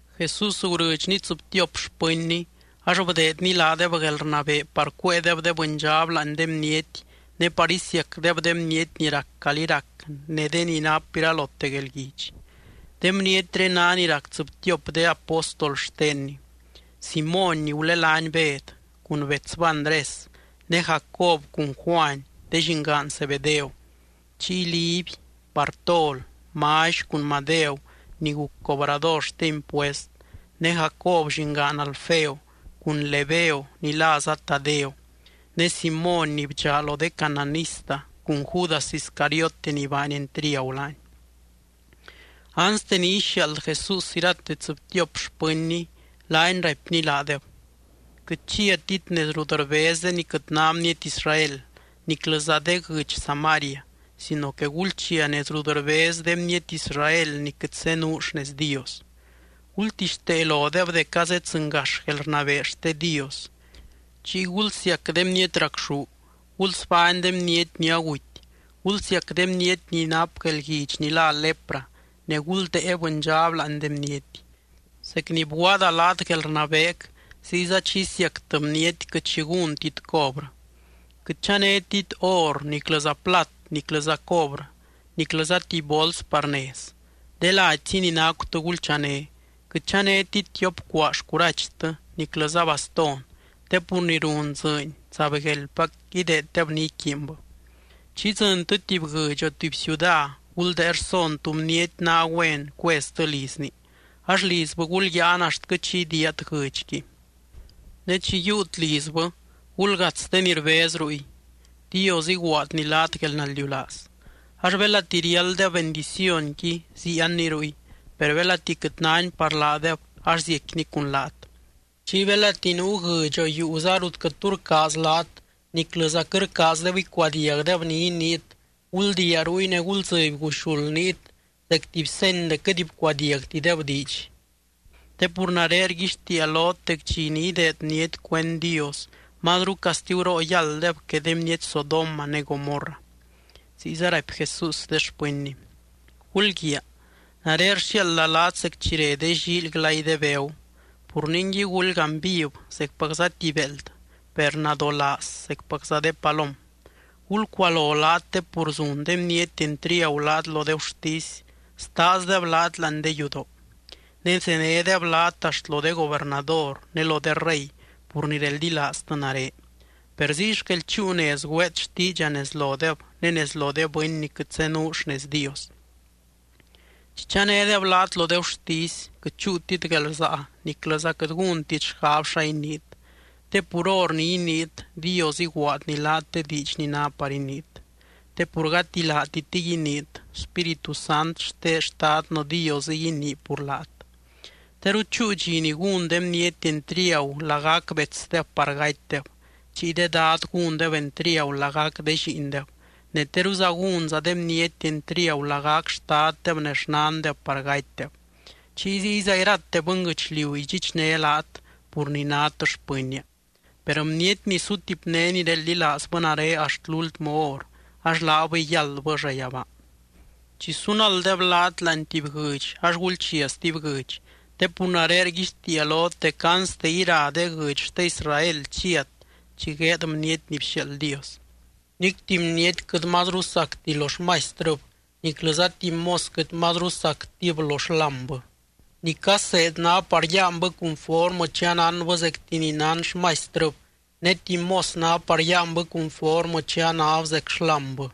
Jesús gurɨdxny tsɨbtiop xpɨnny, ax bdeedny laadeb guelrnabee par cuéedeb de bɨndxab láani de bniety ne par isiacdeb de bniety ni rac calí rac ne de ni nap iralote guelguidx. De bnietré ná ni rac tsɨbtiop de apóstol xtenny: Simóny ni gulelány Bed, cun betsbɨ Andrés, ne Jacob cun Juany de llingaan Zebedeo. Chiy Liby, Bartol, Mally cun Madeu ni guc cobrador xte impuest, ne Jacob llingaan Alfeo cun Lebeo ni láza Tadeo ne Simóny ni bdxaa lo de cananista cun Judas Iscariote ni baany entriagu laany. Anste ni ixiaald Jesús irate tsɨbtiop xpɨnny, laany raipny laadeb: —Quɨt chiatit nez rut rbez de ni quɨt ná bniety Israel, niclɨza de guɨdx Samaria sino que gulchia nez rut rbez de bniety Israel ni quɨt zenuu xnez Dios. Gultixtee lodeb dec azeddzɨngax guelrnabee xte Dios. Chiy gulsiac de bniety racxú, gulsbány de bniety ni aguty, gulsiac de bniety ni nap guelguidx ni lá lepra, ne guldée bɨndxab láani de bniety. Zec ni bguaada laat guelrnabeec, ziyza chi isiactɨ bniety quɨt xi gúntit cobrɨ. ’Quɨt chanétit or, niclɨza plat, niclɨza cobrɨ, niclɨza tuby bols par nez. De ladyzi ni nacutɨ gulchané, quɨt chanétit tiop cuaa xcurachtɨ niclɨza bastón. Te pur ni run dzɨɨny zaibgueldpac ideeddeb ni iquiinbɨ. ’Chi idzɨntɨ tuby guɨdx o tuby ciuda, guldée rson tú bniety ná güen cueztɨ lizni, ax lizbɨ gulyáan axtquɨ chi idiiat guɨdxqui. Ne chi yiiut lizbɨ, gulgats de ni rbez ruy: Dios iguaadny laat guelnaldiulaaz. Ax belati riálddeb bendicionqui ziianni ruy, per belati quɨt náni par laadeb ax ziecquini cun laat. Chiy belati nuu guɨdx o yuuza rut quɨt tu rcaaz laat niclɨza quɨt rcaazdeb icuadiagdeb ni iniit, guldiia ruy ne guldzɨby guxuld niit zec tuby seny dec quɨt bcuadiagtideb diidx. Te pur nare rguixtiia lot dec dxi ni ideed bniety cuend Dios, mazru castiguroo yálddeb que de bniety Sodoma ne Gomorra. Ziyza raipy Jesús de xpɨnny: —¡Gulguiaa! Nare rxiaalda laat zec chi re de llíily glay de begu. Pur ningui gulgaany viv zecpacza tuby béeld, per nadolaaz zecpacza de palom. Gulcualo laat te pur zun de bniety entriagu laat lo de gurtisy, staazdeb laat láani de yudoo. Ne zenédeb laat axt lo de gobernador ne lo de rey pur ni reldilaaztɨ nare, per ziy xquel chúu nez güeet xtiidxa nez lodeb ne nez lo de bɨny ni quɨt zenuu xnez Dios. Chi chanédeb laat lo de gurtisy quɨt chúutit guelrsaa niclɨza quɨt gúntit xgab xa iniit, te pur hor ni iniit, Dios iguaadny laat de diidx ni ná par iniit. Te pur gati laatitɨy iniit, Spíritu Sant xte Xtadnɨ Diosɨy inii pur laat. ’Teru chúu dxi ni gún de bniety entriagu lagac betsdeb par gatydeb. Chiy de dad gúndeb entriagu lagac de lliindeb, ne teruza gúnza de bniety entriagu lagac xtaddeb ne xnandeb par gatydeb. Chiy ziyza irate bɨnguɨchliu idxichné laat pur ni nát xpɨnnia, per bniety ni sutipné ni reldilaazbɨ nare axt lúltmɨ hor, ax laabɨy yáldbɨ llayabaa. Chi sunalddeb laat láani tuby guɨdx ax gulchia stuby guɨdx, te pur nare rguixtiia lot dec anste ira de guɨdx xte Israel chiat chi gueed Bniety ni bxiaald Dios. ’Nic tuby bniety quɨt mazru sacti lo xmaistrɨb, niclɨza tuby mos quɨt mazru sactib lo xlámbɨ. Ni caseed ná par yáanbɨ cunformɨ chi anánbɨ zecti ni nán xmaistrɨb ne tuby mos ná par yáanbɨ cunformɨ chi anáb zec xlámbɨ.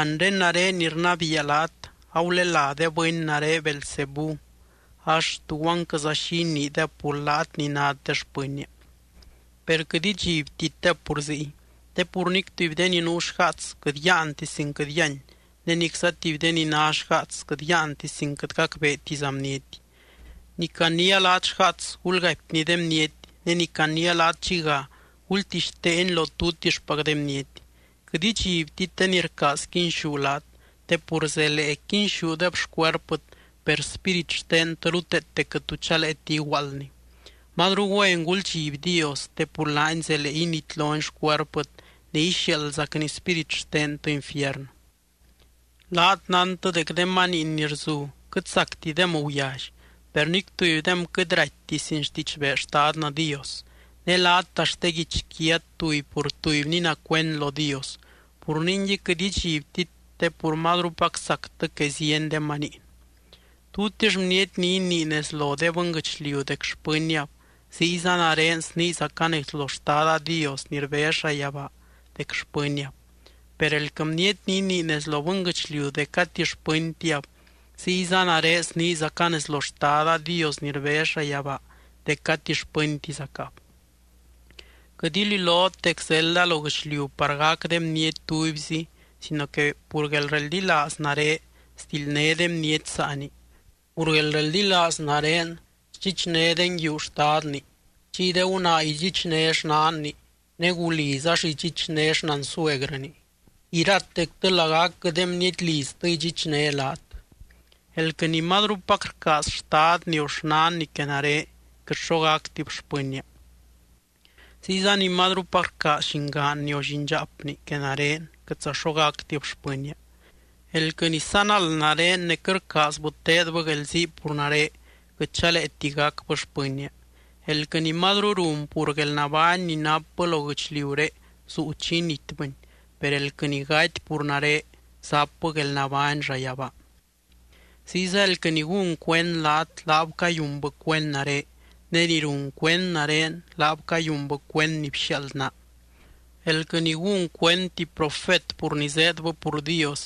Anre nare ni rnabiia laat, agulelá de bɨny nare Beelzebú ax, ¿tuguanquɨza xi iniideb pur laat ni nát de xpɨnnia? ’Per quɨt idxibtitdeb pur ziy, te pur nic tuby de ni nuu xgaats quɨt yáanti sin quɨt yíany, ne nicza tuby de ni ná xgaats quɨt yáanti sin quɨt gacbeetiza bniety. Ni caniia laat xgaats, gulgaipni de bniety, ne ni caniia laat dxiga gultixteeni lo tutixpac de bniety. Quɨt idxibtit de ni rcaaz quinxú laat. Te pur zelee quinxúdeb xcuerpɨt, per spírit xtentɨ ruteete quɨt tu chaleeti iguaaldni. Mazru güen guldxiby Dios te pur laany zelee initlony xcuerpɨt ne ixiaaldzacny spírit xtentɨ infiernɨ. ’Laat nántɨ dec de maniin ni rzu quɨt sactidem guyally, per nic tubydem quɨt raitti sin xtidxbee Xtadnɨ Dios. Ne laat axt de guichquiat tuby pur tubyni ná cuend lo Dios. Pur ningui, quɨt idxibtit te pur mazrupac sactɨ que zieny de maniin. ’Tutix bniety ni inii nez lo de bɨnguɨchliu dec xpɨnniab, ziyza nare sniizaca nez lo Xtada Dios ni rbez llayabaa dec xpɨnniab. Per elquɨ bniety ni inii nez lo bɨnguɨchliu dec gati xpɨntiab, ziyza nare sniizaca nez lo Xtada Dios ni rbez llayabaa dec gati xpɨntizacab. ’Quɨt ililot dec zelda lo guɨchliu par gac de bniety tubyzi sino que pur guelreldilaaz nare, sdildné de bniety saani. Pur guelreldilaaz nare sdxichné de nguiu xtadni, chiy de gunaa idxichné xnanni, ne guliz ax idxichné xnansuegrɨni. Iratectɨ lagacquɨ de bniety liztɨ idxichné laat. ’Elquɨ ni mazrupac rcaaz xtadni, o xnanni que nare, quɨt xo gactib xpɨnnia. Ziyza ni mazrupac rcaaz llingaanni o llindxaapni que nare, quɨtza xo gactib xpɨnnia. Elquɨ ni sanald nare ne quɨt rcaazbɨ teedbɨ guelzii pur nare, quɨt chaleeti gacbɨ xpɨnnia. Elquɨ ni mazru run pur guelnabány ni napbɨ lo guɨchliuré, zuu chi initbɨni. Per elquɨ ni gaty pur nare, zapbɨ guelnabány llayabaa. ’Ziyza elquɨ ni gún cuend laat, laab cayunbɨ cuend nare. Ne ni run cuend nare, laab cayunbɨ cuend ni bxiaald naa. Elquɨ ni gún cuend tuby profet pur ni zéedbɨ pur Dios,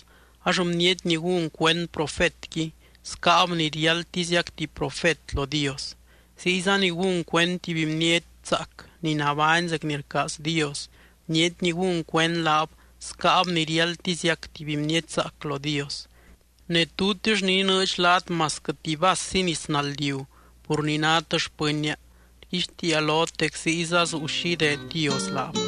ax bniety ni gún cuend profetqui, scáab ni riáldtiziac tuby profet lo Dios. Ziyza ni gún cuend tuby bniety zaac ni nabány zec ni rcaaz Dios, bniety ni gún cuend laab, scáab ni riáldtiziac tuby bniety zaac lo Dios. Ne tutix ni inɨɨdx laat masquɨ tuby vassi nis naldiu pur ni nát xpɨnnia, rguixtiia lot dec ziyza zuu xi ideed Dios laab.